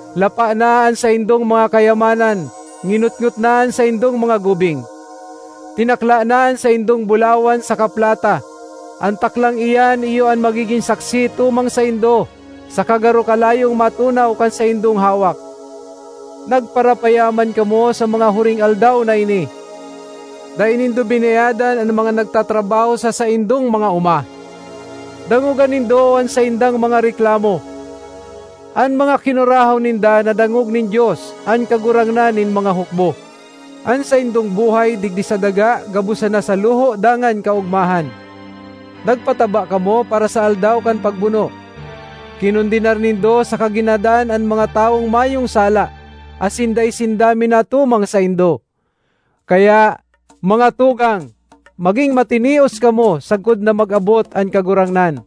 Lapa na an saindong mga kayamanan, nginotngot na an saindong mga gubing. Tinakla na an saindong bulawan saka plata; an taklang iyan iyo an magigin saksi tumang saindo, saka garo kalayong matunaw kan saindong hawak. Nagparapayaman kamo sa mga huring aldaw na ini. Dai nindo binayadan an mga nagtatrabaho sa saindong mga oma. Dangoga nindo an saindang mga reklamo! An mga kinurahaw ninda nadangog nin Dios, an Kagurangnan nin mga hukbo. An saindong buhay digdi sa daga gabos sana sa luho dangan kaogmahan. Nagpataba kamo para sa aldaw kan pagbuno. Kinondenar nindo saka ginadan an mga tawong mayong sala, asin dai sinda minatumang saindo. Kaya, mga tugang, maging matinios kamo sagkod na mag-abot an Kagurangnan.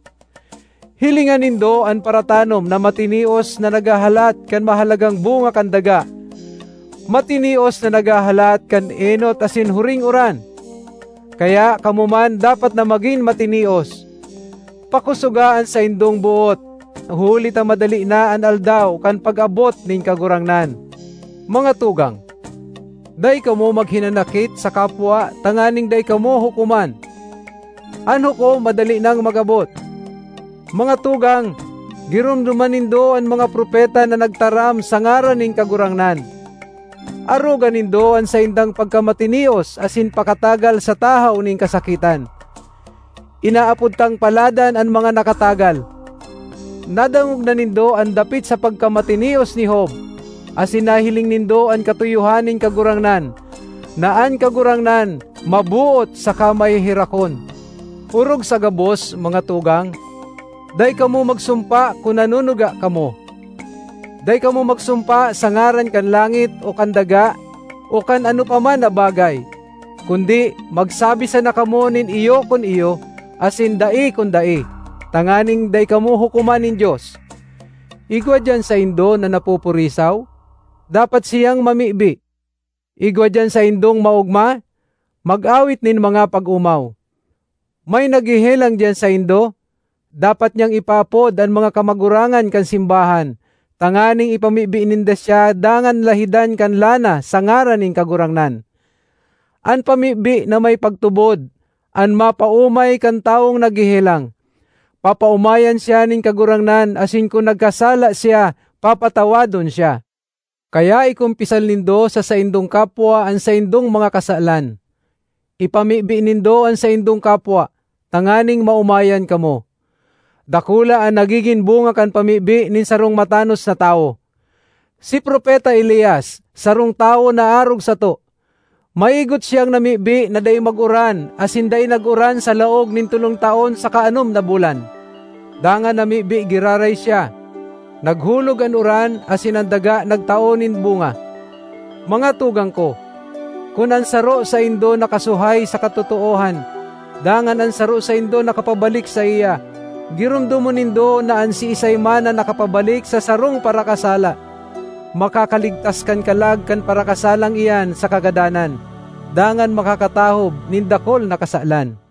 Hilinga nindo an paratanom na matinios na naghahalat kan mahalagang bunga kan daga; matinios na naghahalat kan enot asin huring uran! Kaya kamo man dapat na magin matinios! Pakosoga an saindong boot, huli ta madali na an aldaw kan pag-abot nin Kagurangnan. Mga tugang, dai kamo maghinanakit sa kapwa tanganing dai kamo hukoman. An Hukom madali nang mag-abot! Mga tugang, giromdoma nindo an mga propeta na nagtaram sa ngaran nin Kagurangnan. Aroga nindo an saindang pagkamatinios asin pakatagal sa tahaw nin kasakitan. Inaapod tang paladan an mga nakatagal. Nadangog na nindo an dapit sa pagkamatinios ni Job; asin nahiling nindo an katuyohan nin Kagurangnan, na an Kagurangnan maboot saka maheherakon. Orog sa gabos, mga tugang, dai kamo magsumpa kun nanunuga kamo; dai kamo magsumpa sa ngaran kan langit, o kan daga, o kan ano pa man na bagay. Kundi magsabi sana kamo nin “Iyo” kun iyo; asin “Dai” kun dai, tanganing dai kamo hukoman nin Dios. Igwa diyan saindo na napupurisaw? Dapat siyang mamibi. Igwa diyan saindong maogma? Mag-awit nin mga pag-omaw. May naghehelang diyan saindo? Dapat niyang ipaapod an mga kamagurangan kan simbahan, tanganing ipamibi ninda siya dangan lahidan kan lana sa ngaran nin Kagurangnan. An pamibi na may pagtubod an mapaomay kan tawong naghehelang. Papaomayan siya nin Kagurangnan asin kun nagkasala siya, papatawadon siya. Kaya ikumpisal nindo sa saindong kapwa an saindong mga kasalan; ipamibi nindo an saindong kapwa, tanganing maomayan kamo. Dakula an nagigin bunga kan pamibi nin sarong matanos na tawo. Si Propeta Elias sarong tawo na arog sato. Maigot siyang namibi na dai mag-uran, asin dai nag-uran sa laog nin tolong taon saka anom na bulan. Dangan namibi giraray siya; naghulog an uran, asin an daga nagtao nin bunga. Mga tugang ko, kun an saro saindo nakasuhay sa katotoohan, dangan an saro saindo nakapabalik saiya, giromdomon nindo na an siisay man na nakapabalik sa sarong parakasala, makakaligtas kan kalag kan parakasalang iyan sa kagadanan, dangan makakatahob nin dakul na kasalan.